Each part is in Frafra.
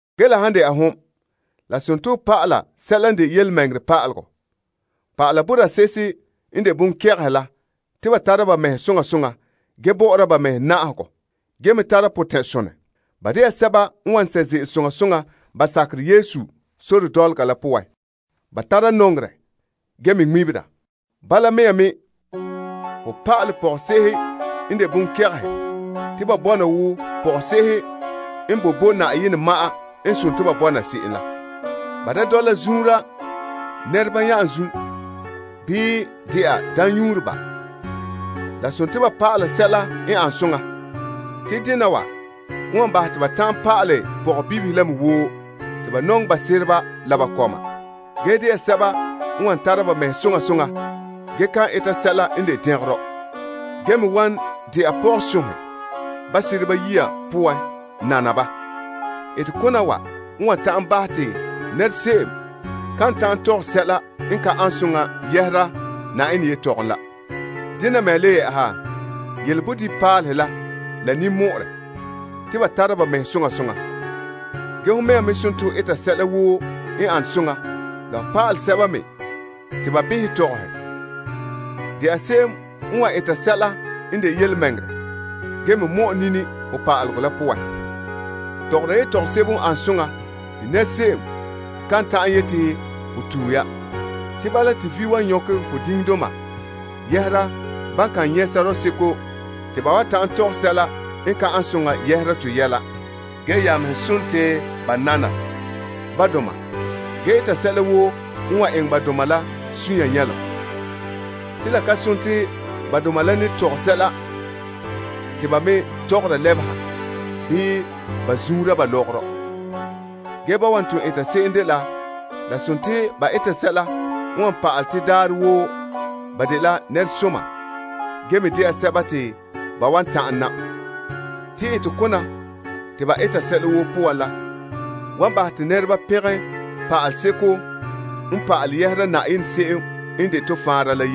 Ge la han dɛna hon, la dela ho pa'ala sɛla n de yelemɛŋɛrɛ pa'alegɔ. Pa'ala boraa se'ehe n de bonkɛgehe la te ba tara ba mɛhe soŋa soŋa gee bɔ'ɔra ba mɛhe na'ahegɔ gee me tara potɛn'sonɛ. Ba de'a sɛba n wan sɛ' ze'ele soŋa soŋa ba sakerɛ Yesu sore dɔlɔga la poan. Ba tara nɔŋerɛ ge me ŋmebera. Bala mea me, ho pa'alɛ pɔgɔse'ehe n de bonkɛgehe te ba bɔna wo pɔgɔse'ehe n boe bo Yenɛ ma'an n sontii ba bɔna se'em la. Ba da dɔla zuunra nɛreba nya'anzum bii de'a daamnyuureba. La dela ba pa'ala sɛla n an soŋa. Te dena wa n wan bahɛ te ba ta'an pa'alɛ pɔgɔbibihe la me woo te ba nɔŋɛ ba sereba la ba kɔma, ge dɛna sɛba n wan tara ba mɛhe soŋa soŋa ge kan eta sɛla n de dɛngerɔ, ge me wan dɛna pɔgɔsonhe ba sereba yiya poan nana ba. Etekona wa n wan ta'an bahɛ te nɛra se'em kan ta'an tɔgɛ sɛla n ka an soŋa yɛhera Yenɛ yetɔgom la. Dene mea le yɛ'ɛha, yele bodibinpaalehe la la ninmɔ'ɔrɛ te ba tara ba mɛhe soŋa soŋa. Ge hon mɛŋa me sontii ho eta sɛla woo n ane soŋa la ho pa'alɛ sɛba me te ba behɛ tɔgɔhe. De'a se'em n wan eta sɛla n de yelemɛŋɛrɛ ge me mɔ'ɛ nini ho pa'alegɔ la poan. Tɔgɔra yetɔgom sebo n ane soŋa te se'em kan ta'an yete ho tue ya. Te bala te vi' wan nyɔkɛ ho diŋdoma yɛhera ba kan nyɛ' sɔrɔɔ seko te ba wan ta'an tɔgɛ sɛla n ka an soŋa yɛhera to yɛla. Ge ya mɛhe sontii ba nana ba doma ge eta sɛla woo n wan eŋɛ ba doma la sunya nyɛlom. Te la ka sontii ba doma la ne tɔgɛ sɛla, te ba me tɔgɔra lebeha bii ba zuunra ba lɔgɔrɔ. Ge ba wan ton eta se'em dela la sontii ba eta sɛla n wan pa'alɛ te daarɛ woo ba dela nɛresoma ge me dɛna sɛba te ba wan ta'an nam. Te la wan bahɛ te nɛreba pɛngɛ Yenɛ se'em n de to Faanra la.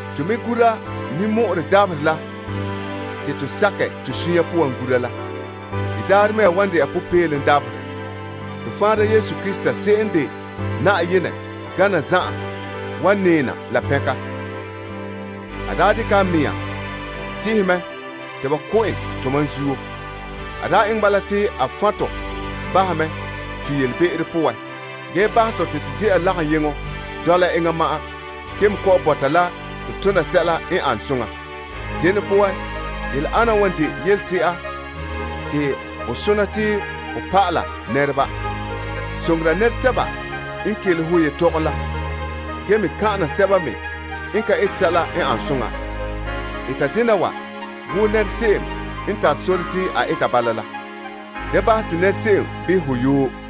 To me gura ninmɔ'ɔrɛ dabaherɛ la te to sakɛ to sunya poan gura la. De daarɛ mea wan dɛna popeelom dabaherɛ. To Faanra Yesu Krista se'em n de Yenɛ gane zan'an wan nɛɛ na la pɛnka. A daa dekɛ a mɛŋa tihɛ mɛ te ba ko' en tomam zuo. A daa eŋɛ bala te a fan' to bahɛ mɛ to yelebe'ero poan ge bahɛ tɔ te to dɛ'a lagaŋyeŋɔ dɔla enŋa ma'an ge me kɔ'ɔn bɔta la to tona sɛla n ane soŋa. Dene poan, yele ana wa n de yelese'a te ho sona te ho pa'ala nɛreba. Soŋora nɛresɛba n kelehe ho yetɔgom la ge me kan'ana sɛba me n ka ete sɛla n an soŋa. Eta dena wa wo nɛra se'em n tare sore te a eta bala la. Da bahɛ te nɛra se'em behɛ ho yoo.